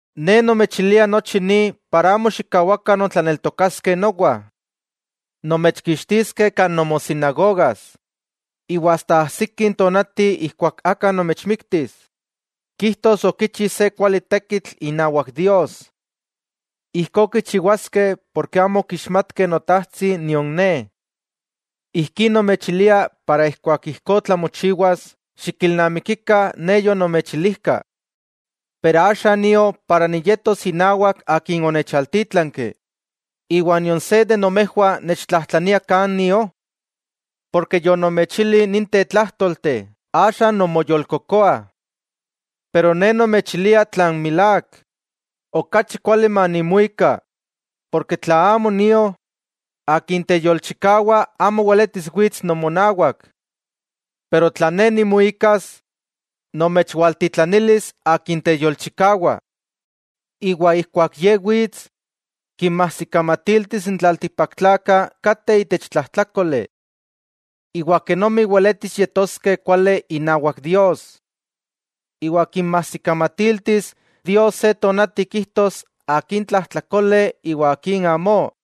'Ne nomechilia nochi ni para amo xikkawakah nontlaneltokaskeh nowa. Nomechkixtiskeh kan nomosinagogas. Iwa ajsiki tonati ijkuak aka nomechmiktis, kijtos okichi se kuali tekitl inawak Dios. Ijkó kichiwaskeh porke amo okixmatkeh Notajtsi nion Ne. Ijkí nomechilia para ijkuak ijkó tlamochiwas xikilnamikikah Ne yonomechilijka. 'Axa nio inawak Akin onechaltítlanki; ¿iwa nion se de nomejwah nechtlajtlania kan nio? Ken yonomechili ninteh tlajtolteh axa nonmoyolkokoah. Pero Ne nomechilia tlan milák: Okachi kuali manimuika, porke tla amo nio, Akin teyolchikawa amo weletis wits nomonawak. Pero tla Ne nimuikas, nomechwaltitlanilis Akin teyolchikawa. Ijkuak Ye wits, kinmajsikamatiltis n tlaltikpaktlakah kateh itech tlajtlákoli. Iwa kenomi weletis yetoskeh kuali inawak Dios. Iwa kinmajsikamatiltis Dios se tonati kijtos akin tlajtlakole iwa akin amó.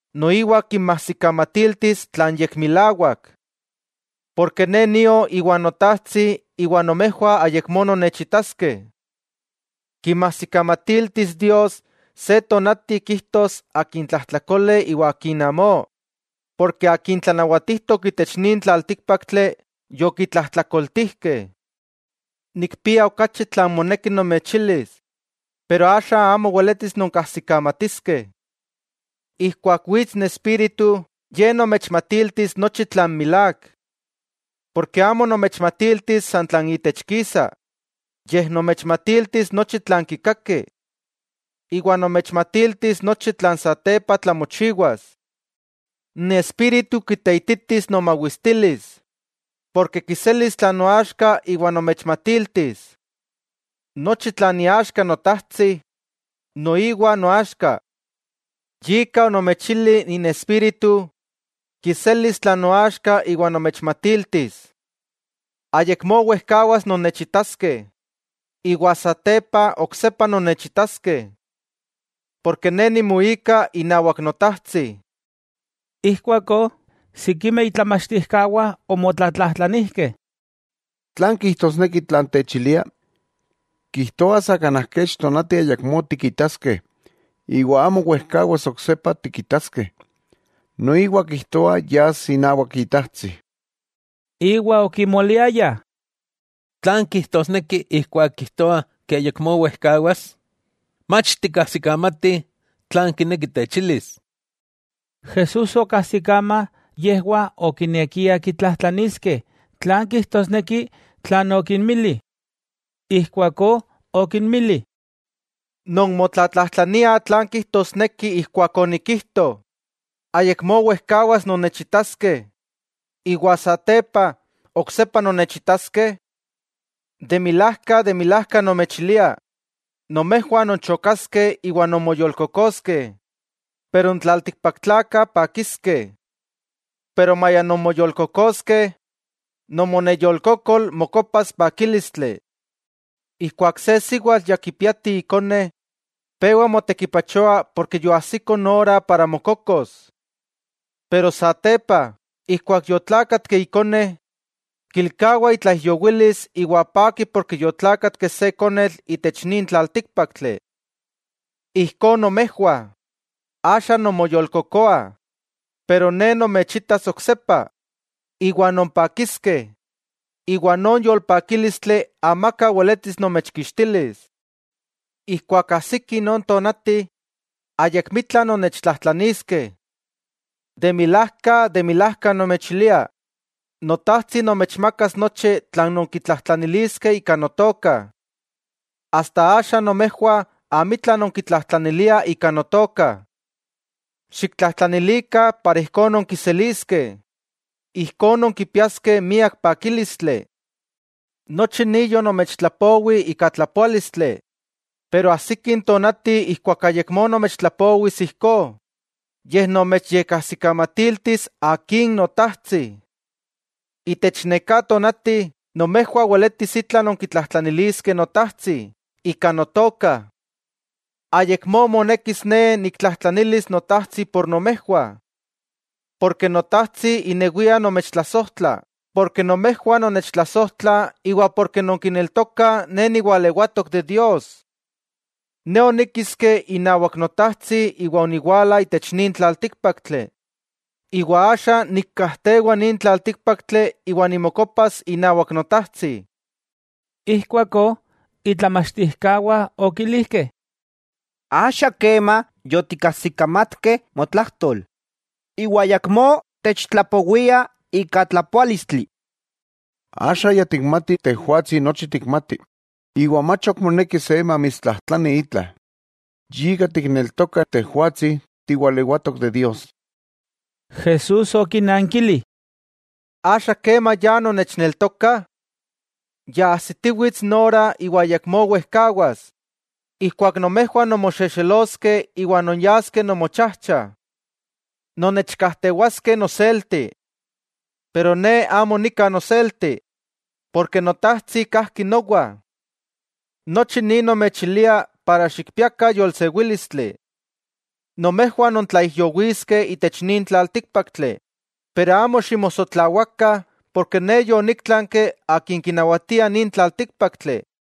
Noiwa kinmajsikamatiltis tlan yekmilawak. Porke Ne nio íwa Notajtsi iwa nomejwah ayakmó nonnechitaskeh. Kinmajsikamatiltis Dios se tonati kijtos akin tlajtlakole iwa akin amó, porke akin tlanawatijtok itech nin tlaltíkpaktli, yokitlajtlakoltijkeh. 'Nikpia okachi tlan moneki nomechilis, pero axa amo weletis nonkajsikamatiskeh. Ijkuak wits n Espíritu, Ye nomechmatiltis nochi tlan milák. Porke amo nomechmatiltis san tlan itech kisa, yej nomechmatiltis nochi tlan kikaki. Iwa nomechmatiltis nochi tlan satepa tlamochiwas. N Espíritu kiteititis nomawistilis, ken kiselis tlan noaxka iwa nomechmatiltis. Nochi tlan iaxka Notajtsi, noiwa noaxka. Yika onomechili n Espíritu, kiselis tlan noaxka iwa nomechmatiltis. 'Ayakmó wejkawas nonnechitaskeh, iwa satepa, oksepa nonnechitaskeh. Porke Ne nimuika inawak Notajtsi. Ijkuakó, sikimeh itlamachtijkawah omotlatlajtlanijkeh: —¿Tlan kijtosneki tlan techilia? Kijtoa sa kanaj kech tonati ayakmó tikitaskeh, iwa amo wejkawas oksepa tikitaskeh, noiwa kijtoa yas inawak Itajtsi. Iwa okimoliayah: ¿tlan kijtosneki ijkuak kijtoa ke ayakmó wejkawas? Mach tikajsikamatih tlan kineki techilis. Jesús okajsikama yejwah okinekiah kitlajtlaniskeh tlan kijtosneki tlan okinmili. Ijkuakó okinmili: —¿Nonmotlatlajtlaniah tlan kijtosneki ijkuak onikijto: Ayakmó wejkawas nonnechitaskeh, iwa satepa, oksepa nonnechitaskeh? De milajka, de milajka nomechilia, nomejwah nonchokaskeh iwa nonmoyolkokoskeh, pero n tlaltikpaktlakah pakiskeh. Maya nonmoyolkokoskeh, nomoneyolkokol mokopas pakílistli. Ijkuak se siwatl ya kipiati ikone, pewa motekipachoa porke yoajsiko ora mokokos. Pero satepa, ijkuak yotlákatki ikone, kilkawa itlaijyowilis iwa paki porke yotlákatki se konetl itech nin tlaltíkpaktli. Ijkó nomejwah, axa nonmoyolkokoah, pero Ne nomechitas oksepa, iwa nonpakiskeh, iwa non yolpakílistli, amaka weletis nomechkixtilis. 'Ijkuak ajsiki non tonati, ayakmitla nonnechtlajtlaniskeh. De milajka, de milajka nomechilia, Notajtsi nomechmakas nochi tlan nonkitlajtlaniliskeh ika Notoka. Asta axa nomejwah amitla nonkitlajtlaniliah ika Notoka. Xiktlajtlanikah ijkó nonkiseliskeh, ijkó nonkipiaskeh miak pakílistli. 'Nochi ni yonomechtlapowi ika tlapoálistli, pero ajsiki n tonati ijkuak ayakmó nomechtlapowis ijkó, yej nomechyekajsikamatiltis Akin Notajtsi. Itech neká tonati nomejwah weletis itla nonkitlajtlaniliskeh Notajtsi ika Notoka. Ayakmó monekis Ne niktlajtlanilis Notajtsi por nomejwah. Notajtsi inewia nomechtlasojtla porke nomejwah nonnechtlasojtlah iwa ken nonkineltokah Ne niwalewatok de Dios. Ne oníkiski inawak Notajtsi iwa oniwala itech nin tlaltíkpaktli, iwa axa nikkajtewa nin tlaltíkpaktli iwa nimokopas inawak Notajtsi. Ijkuakó itlamachtijkawah okilijkeh: —Axa kema yotikajsikamatkeh motlajtol, iwa ayakmó techtlapowia ika tlapoálistli. Axa ya tikmatih Tejwatsi nochi tikmati, iwa mach ok moneki se mamitstlajtlani itla. Yika tikneltokah Tejwatsi tiwalewatok de Dios. Jesús okinnankili: —¿Axa kema ya nonnechneltokah? Ya ajsitiwits n ora iwa ayakmó wejkawas, ijkuak nomejwah nonmoxexeloskeh iwa nonyaskeh nomochajcha. Nonnechkajtewaskeh noselti. Pero Ne amo nika noselti, porke Notajtsi kajki nowa. Nochi ni nomechilia, para xikpiakah yolsewílistli. Nomejwah nontlaijyowiskeh itech nin tlaltíkpaktli, pero amo ximosotlawakah porke Ne yoníktlanki akin kinawatia nin tlaltíkpaktli.